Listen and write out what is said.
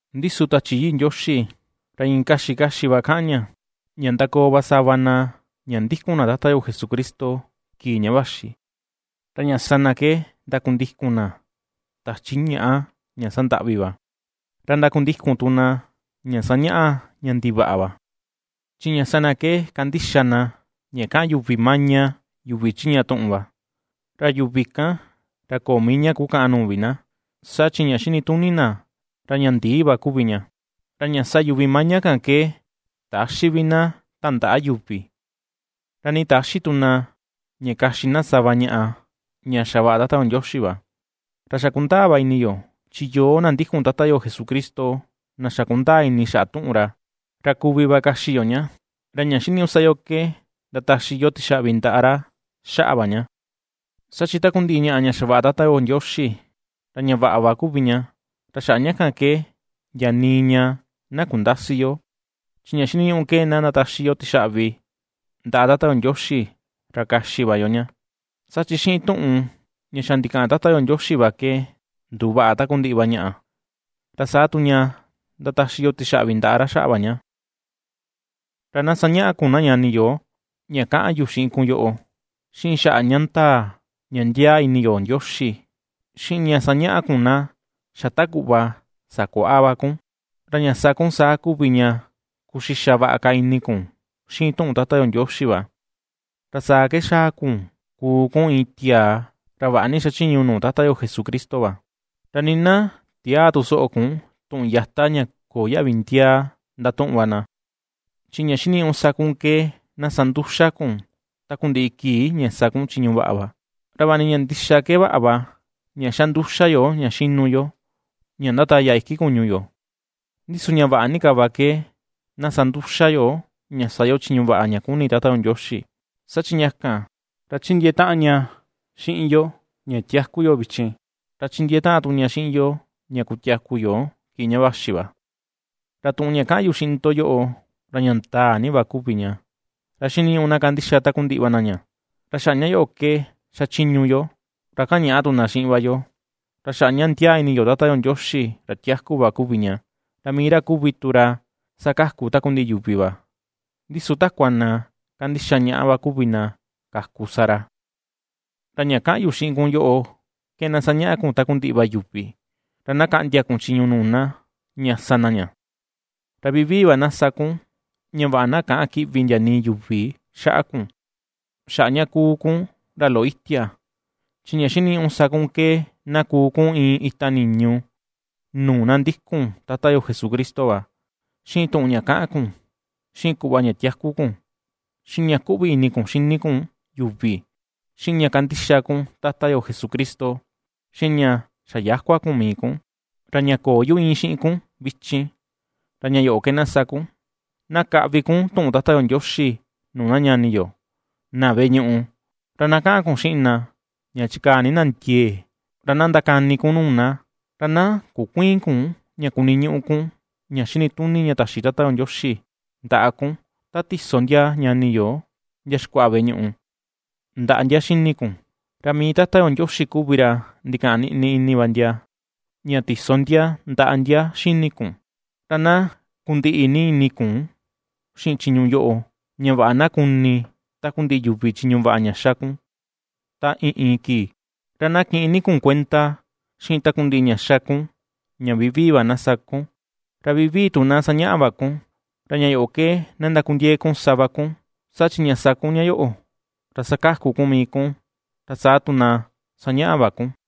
Ndi su Tachi Yii Ndioxi ra iin kaxi kaxi va kaꞌan ña, ña ndakoo va sava na ña ndikun na Tata yo Jesucristo kii ña vaxi, ra ña sa na ke ndakundikun na tachi ñaꞌa ña sandaꞌvi va, ra ndakundikun tu na ña sañaꞌa ña ndivaꞌa va. Chi ña sa na ke kandixa na ña kaꞌan yuvi maña, yuvi chiꞌña tuꞌun va, ra yuvi kan, ra köo mii ña kukaꞌan nuu vi na, saa chi ña xinituni na, ra ña ndii va kuvi ña. Ra ña sa yuvi maña kan ke täxi vi na tandaꞌa yuvi, ra nii täxi tu na ña kaxi na sava ñaꞌa ña xavaꞌa Tata yo Ndioxi va; ra xa kundaa va ini yo, chi yoo na ndikun Tata yo Jesucristo na xa kundaa ini xaꞌa tuꞌun ra, ra kuvi va kaxi yo ña, ra ña xiniñuꞌu sa yo ke ndataxi yo tixaꞌvi ndaꞌa ra xaꞌa va ña. Saa chi takundiꞌi ñaꞌa ña xavaꞌa Tata yo Ndioxi ra ña vaꞌa va kuvi ña, ra xaꞌa ña kan ke ndia nii ña na kundäsi yo, chi ña xiniñuꞌu ke na ndataxi yo tixaꞌvi ndaꞌa Tata yo Ndioxi, ra kaxi va yo ña. Saa chi xiꞌin tuꞌun ña xa ndikaꞌan Tata yo Ndioxi va ke nduvaꞌa takundiꞌi va ñaꞌa, ra saa tu ña ndataxi yo tixaꞌvi ndaꞌa ra xaꞌa va ña. Ra na ^sañaꞌa kun na ñani yo ña kaꞌan yu xiꞌin kun yoꞌo, xiꞌin xaꞌa ña ndaa ña ndiaa ini yo Ndioxi, xiꞌin ña ^sañaꞌa kun na ^xa ta kuꞌva sakuaꞌa va kun, ra ña sa kuu saa kuvi ña kuxixa vaꞌa ka ini kun xiꞌin tuꞌun Tata yo Ndioxi va. Ra saa ke xaa kun kuu kun iin tiaa ra vaꞌa ni xachiñu nuu Tata yo Jesucristo va. Ra nii na tiäa tu soꞌo kun tuꞌun yata ña köo yaꞌvi ndiaa ndatuꞌun va na, chi ña xiniñuꞌu sa kun ke na sa nduxa kun takundiꞌi kii ña sa kun chiñu vaꞌa va. Ra vaꞌa ni ña ndixa ke vaꞌa va ña xa nduxa yo ña xinu yo ña ndataya iki kuñu yo, ndi su ña vaꞌa ni ka va ke na sa nduxa yo ña sa yo chiñu vaꞌa ña kuni Tata yo Ndioxi, saa chi ña kan, ra ^chindiee taꞌan ña xiꞌin yo ña tiaku yo vichin, ra chindiee taꞌan tu ña xiꞌin yo ña kutiaku yo kii ña vaxi va. Ra tuꞌun ña kaꞌan yu xiꞌin ndo yoꞌo, ra ña ndaa ni va kuvi ña, ra xiniñuꞌu na kandixa takundiꞌi va na ña. Ra xaꞌa ña yoꞌo ke xachiñu yo ra kañaꞌa tu na xiꞌin va yo, ra xaꞌa ña ndiaa ini yo Tata yo Ndioxi ra tiaku va kuvi ña, ra mii ra kuvi tu ra sakaku takundiꞌi yuvi va, ndi su takua na kandixa ñaꞌa va kuvi na kaku sa ra. Ra ña kaꞌan yu xiꞌin kun yoꞌo, ke na sañaꞌa kun takundiꞌi va yuvi, ra na kaꞌndia kun chiñu nuu na, ña na sa na ña. Ra vivii va na sa kun ña vaꞌa na käꞌan kiꞌvi ndia nii yuvi xaꞌa kun, xaꞌa ña ^kuu kun ra loꞌo itia, chi ña xiniñuꞌu sa kun ke na kuu kun iin ita niñu nuu na ndikun Tata yo Jesucristo va, xiꞌin tuꞌun ña kaꞌan kun, xiꞌin kuꞌva ña tiaku kun, xiꞌin ña kuꞌvi ini kun xini kun yuvi, xiꞌin ña kandixa kun Tata yo Jesucristo, xiꞌin ña xayäkua kun mii kun. Ra ña köo yu íin xiꞌin kun vichin, ra ña yoꞌo ke na sa kun: na kaꞌvi kun tuꞌun Tata yo Ndioxi nuu na ñani yo na veꞌe ñuꞌu, ra na kaꞌan kun xiꞌin na ña chikaa ni na ndiee, ra na ndakani kun nuu na. Ra na kukuïin kun ña kuniñuꞌu kun ña xinituni ña taxi Tata yo Ndioxi ndaꞌa kun ta tiso ndia ñani yo ndia xikuaꞌa veꞌe ñuꞌu ndaꞌa ndia xini kun, ra mii Tata yo Ndioxi kuvi ra ndikaꞌan niꞌni ini ndia ña tiso ndia ndaꞌa ndia xini kun. Ra na kundiꞌi ni ini kun xiꞌin chiñu yoꞌo, ña vaꞌa na kuni takundiꞌi yuvi chiñu vaꞌa ña ^xa kun ta iin iin kii. Ra na kiꞌin ni kun kuenda xiꞌin takundiꞌi ña ^xa kun ña vivii va na sa kun, ra vivii tu na sañaꞌa va kun, ra ña yoꞌo ke na ndakundiee kun sa va kun, saa chi ña sa kun ña yoꞌo, ra sakaku kun mii kun, ra saa tu na ^sañaꞌa va kun.